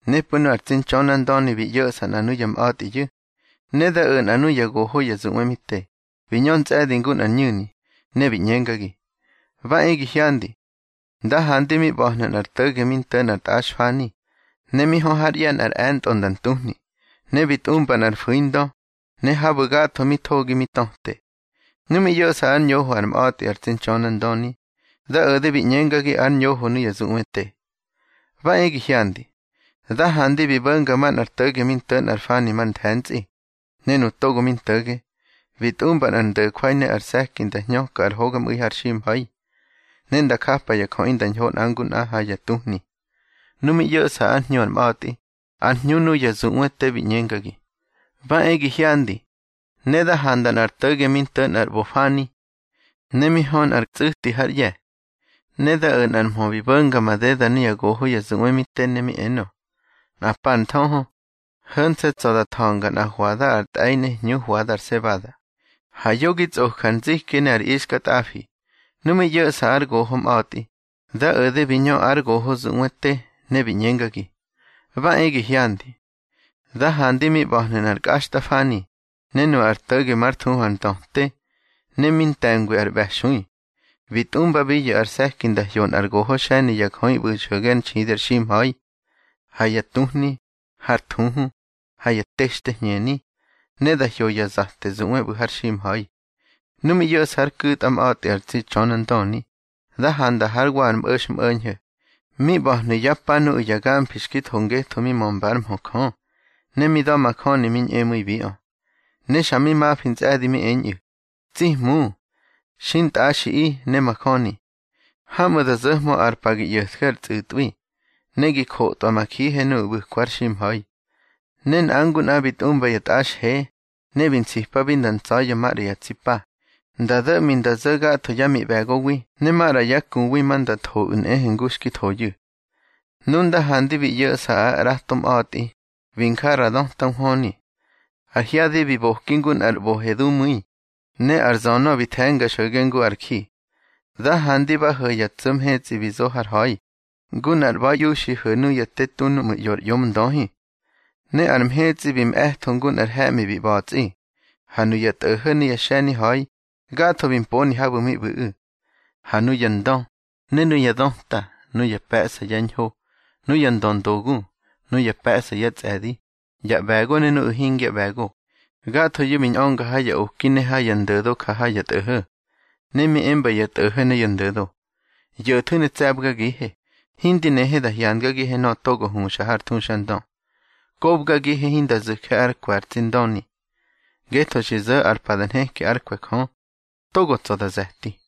Nepꞌu̱ nu ar tsi Ntxönandöni bi ꞌyo̱ꞌsa nꞌa nuya mꞌa̱tꞌiyu̱. Ne da o̱ nꞌa nuya goho ya zuꞌwe mi te, bi ñö ntsꞌe̱di ngu nꞌar ñu̱ni, ne bi ꞌñengagi: —Ba e gi hyandi. Nda handi mi ꞌba̱hnu̱ nꞌar to̱ge mi nto̱ nꞌar tꞌaxfani, ne mi hö hár ꞌye̱ nꞌar e̱ntꞌo nda ntuhni. Ne bi tꞌumba nꞌar fu̱indö, ne habu̱ gatho mi thogi mi töte. Nu mi ꞌyo̱ꞌsa ár ñoho ar mꞌa̱tꞌi ar tsi Ntxönandöni, da o̱de bi ꞌñengagi ár ñoho nuya zuꞌwe te: —Ba e gi hyandi. Da handi bi bo̱nga manꞌar to̱ge mi nto̱ nꞌar fani mar nthe̱ntsꞌi. Ne nu togo mi nto̱ge, bi tꞌumba nꞌar ndo̱jwai ne ar se̱ki nda hñöka ar hogamꞌu̱i har ximha̱i, ne nda japa ya jöꞌi nda ñho nꞌa ngu nꞌa ha ya tuhni. Nu mi ꞌyo̱ꞌsa ár hñu ar mꞌa̱tꞌi, ár hñu nuya zuꞌwe te bi ꞌñengagi: —Ba e gi hyandi. Ne da handa nꞌar to̱ge mi nto̱ nꞌar ꞌbofani, ne mi hö nꞌar tsꞌu̱ti hár ꞌye̱. Ne da o̱ nꞌar mhö bi bo̱nga madeda nuya goho ya zuꞌwe mi te, ne mi enö: —Nꞌa pa ar nthöhö, ho̱nse̱ tsa̱ da tha̱nga nꞌa hwada ar tꞌe̱i ne hñu hwada ar sebada, ha yo gi tsꞌoju̱ ar nziki ne ar ixkatꞌafi. Nu mi ꞌyo̱ꞌsa ár goho mꞌa̱tꞌi, da o̱de bi ñö ár goho zuꞌwe te, ne bi ꞌñengagi: —Ba e gi hyandi. Da handi mi ꞌba̱hnu̱ nꞌar kꞌaxtꞌafani, ne nu ar to̱ge már thuhu ar Ndöte, ne mi nte̱ngwi ar ꞌBe̱xui. Bi tꞌumbabiyu̱ ar se̱ki nda hyo nꞌar goho xe̱ni ya jöꞌi ꞌbu̱ xo̱ge ár nxidi ar ximha̱i, ha ya tuhni, har thuhu, ha ya texte hñeni, ne da hyo ya zate zuꞌwe ꞌbu̱ har ximha̱i. Nu mi ꞌyo̱ꞌsa ár ku̱tꞌa mꞌa̱tꞌi ar tsi Ntxönandöni, da handa hár wa ar mꞌo̱xmꞌo̱ñho̱, mi ꞌba̱hnu̱ yá pa nuꞌu̱ ya gamfi xki tho ngetho mi mömba ár mhö Jö, ne mi da̱majöni mi ñꞌemu̱ibiꞌö. Ne xa mi mafi ntsꞌe̱di mi eñꞌu̱: —Tsi Hmu, xintꞌaxiꞌi ne majöni. Hamꞌu̱ da zo̱hmö ar pa gi ꞌyo̱tje ar tsꞌu̱tꞌwi, ne gi jotꞌwa ma jihe nuꞌu̱ ꞌbu̱kwa har ximha̱i. Ne nꞌa ngu nꞌa bi tꞌumba ya tꞌaxhe. Ne bi nsipabi nda ntsa̱ya̱ maꞌra ya tsi pa, nda do̱ꞌmi nda zo̱ gatho yá miꞌbe̱gowi ne maꞌra yá kuwi ma nda thoꞌu̱ nꞌehe ngu xki thoyu̱. Nu nda handi bi ꞌyo̱ꞌsa ár ꞌrato mꞌa̱tꞌi, bi nja nꞌa ra döta nhwöni. Ar hyadi bi boki ngu nꞌar ꞌbohe dumu̱i, ne ar zönö bi the̱nga xo̱ge ngu ar ji. Da handi ba ho̱ ya tso̱ mhetsꞌi bi zo har ha̱i, ngu nꞌar ꞌba̱iꞌiuxi ho̱ nuya te tu núꞌmu̱ ꞌyo ar ꞌyomndöhi. Ne ar mhetsꞌi bi mꞌe̱tho ngu nꞌar he̱ꞌmi bi ꞌba̱tsꞌi. Ha nuya tꞌo̱ho̱ ne ya xe̱ni ha̱i, gatho bi mponi habu̱ mi ꞌbu̱ꞌu̱. Ha nuya ndö, ne nuya döta, nuya pe̱ꞌsa ya ñho, nuya ndöndogu, nuya pe̱ꞌsa yá tsꞌe̱di, ya ꞌbe̱go ne nuꞌu̱ hingya ꞌbe̱go, gathoyu̱ bi ñꞌönga ha ya oki ne ha ya ndo̱do ja ha ya tꞌo̱ho̱. Ne mi emba ya tꞌo̱ho̱ ne ya ndo̱do: —Yo̱thu̱ ne tse̱bgagihe, hindi nehe da hyangagihe nöꞌö togo huxa har thuxandö. Kobgagihe hinda zu̱je ár kwe̱ ar tsi Ndöni. Ngetho xi zo̱ ar pa da nheki ár kwe̱ Jö, togo tsa̱ da ze̱ti.